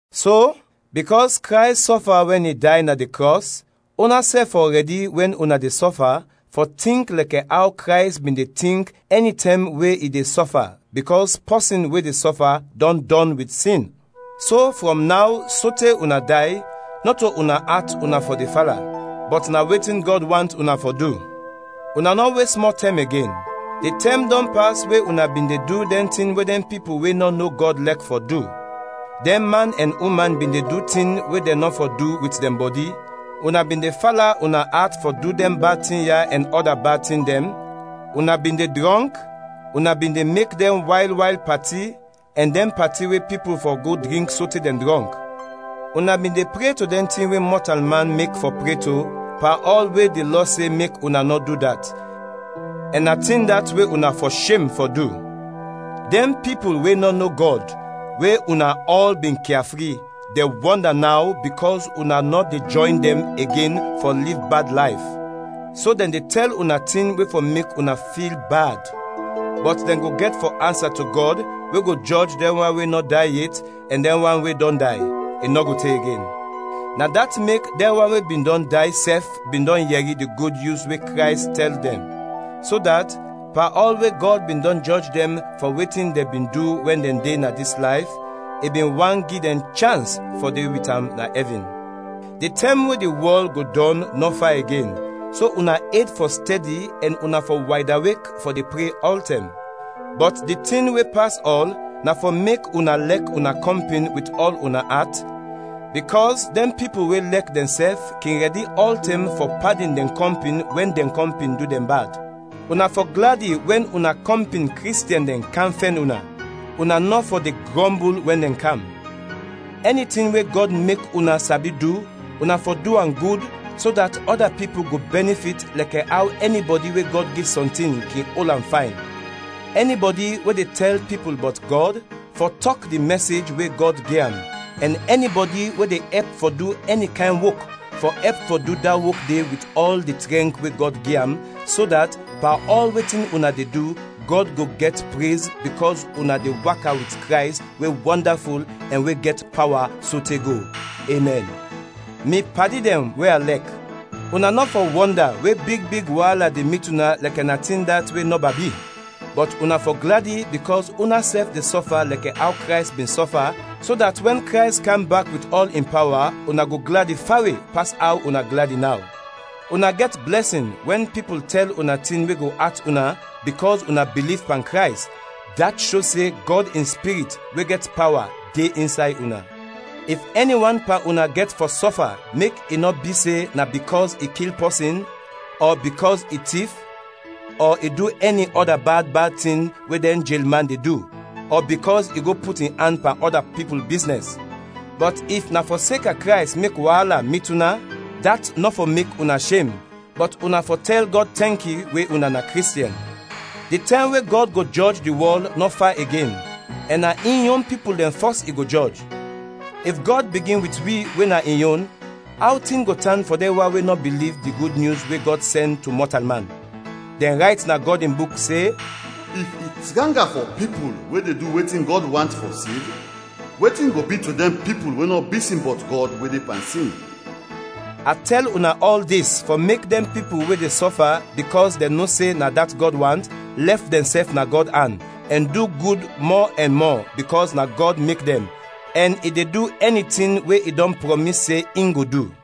So, bikɔs Krays sɔfa wɛn i day na di krɔs, unasɛf fɔ rɛdi wɛn una de sɔfa, fɔ tink lɛkɛ aw Krays bin de tink ɛnitɛm we i de sɔfa, bikɔs pɔsin we de sɔfa dɔn dɔn wit sin. So, frɔm naw sote una day, nɔto una at una fɔ de fala, bɔt na wetin Gɔd want una fɔ du. Una nɔ wes mɔ tɛm igen. Di tɛm dɔn pas we una bin de du dɛn tin we dɛn pipul we nɔ no Gɔd lɛk fɔ du. Dɛn man ɛn uman bin de du tin we dɛn nɔ fɔ du wit dɛn bɔdi, una bin de fala una at fɔ du dɛn bad tin ya ɛn ɔda bad tin dɛn, una bin de drɔnk, una bin de mek dɛn wayl wayl pati, ɛn dɛn pati we pipul fɔ go drink sote dɛn drɔnk. Una bin de pre to dɛn tin we mɔtalman mek fɔ pre to pan ɔl we di Lɔ se mek una nɔ du dat, ɛn na tin dat we una fɔ shem fɔ du. Dɛn pipul we nɔ no Gɔd, we una ɔl bin kia fri, de wɔnda naw bikɔs una nɔ de jɔyn dɛn igen fɔ liv bad layf; so dɛn de tɛl una tin we fɔ mek una fil bad. Bɔt dɛn go gɛt fɔ ansa to Gɔd, we go jɔj dɛn wan we nɔ day yet ɛn dɛn wan we dɔn day, i nɔ go te igen. Na dat mek dɛn wan we bin dɔn day sɛf bin dɔn yɛri di Gud Nyus we Krays tɛl dɛn, so dat, pan ɔl we Gɔd bin dɔn jɔj dɛn fɔ wetin dɛn bin du wɛn dɛn de na dis layf, i bin want gi dɛn chans fɔ de wit am na ɛvin. Di tɛm we di wɔl go dɔn nɔ fa igen, so una ed fɔ stɛdi ɛn una fɔ waydawek fɔ de pre ɔltɛm. Bɔt di tin we pas ɔl, na fɔ mek una lɛk una kɔmpin wit ɔl una at, bikɔs dɛn pipul we lɛk dɛnsɛf kin rɛdi ɔltɛm fɔ padin dɛn kɔmpin wɛn dɛn kɔmpin du dɛn bad. Una fɔ gladi wɛn una kɔmpin Kristiɛn dɛn kam fɛn una, una nɔ fɔ de grɔmbul wɛn dɛn kam. Ɛni tin we Gɔd mek una sabi du, una fɔ du am gud, so dat ɔda pipul go bɛnifit, lɛkɛ aw ɛnibɔdi we Gɔd gi sɔntin kin ol am fayn. Ɛnibɔdi we de tɛl pipul bɔt Gɔd, fɔ tɔk di mɛsej we Gɔd gi am; ɛn ɛnibɔdi we de ɛp fɔ du ɛni kayn wok, fɔ ɛp fɔ du da wok de wit ɔl di trɛnk we Gɔd gi am, so dat, pan ɔl wetin una de du, Gɔd go gɛt prez bikɔs una de waka wit Krays we wɔndaful ɛn we gɛt pawa sote go! Emɛn. Mi padi dɛn we a lɛk, una nɔ fɔ wɔnda we big big waala de mit una lɛkɛ na tin dat we nɔba bi, bɔt una fɔ gladi bikɔs unasɛf de sɔfa lɛkɛ aw Krays bin sɔfa, so dat wɛn Krays kam bak wit ɔl in pawa, una go gladi fawe pas aw una gladi naw. Una gɛt blɛsin wɛn pipul tɛl una tin we go at una bikɔs una biliv pan Krays, dat sho se Gɔd in Spirit, we gɛt pawa, de insay una. If ɛni wan pan una gɛt fɔ sɔfa mek i nɔ bi se na bikɔs i kil pɔsin ɔ bikɔs i tif ɔ i du ɛni ɔda bad bad tin we dɛn jelman de du, ɔ bikɔs i go put in an pan ɔda pipul biznɛs. Bɔt if na fɔseka Krays mek waala mit una, dat nɔ fɔ mek una shem, bɔt una fɔ tɛl Gɔd tɛnki we una na Kristiɛn. Di tɛm we Gɔd go jɔj di wɔl nɔ fa igen, ɛn na in yon pipul dɛn fɔs i go jɔj. If Gɔd bigin wit wi we na in yon, aw tin go tan fɔ dɛn wan we nɔ biliv di Gud Nyus we Gɔd sɛn to mɔtalman? Dɛn rayt na Gɔd in Buk se, “If i tranga fɔ pipul, we de du wetin Gɔd want, fɔ sev; wetin go bi to dɛn pipul we nɔ bisin bɔt Gɔd, we de pan sin?” A tɛl una ɔl dis fɔ mek dɛn pipul we de sɔfa bikɔs dɛn no se na dat Gɔd want, lɛf dɛnsɛf na Gɔd an, ɛn du gud mɔ ɛn mɔ, bikɔs na Gɔd mek dɛn, ɛn i de du ɛni tin we i dɔn prɔmis se in go du.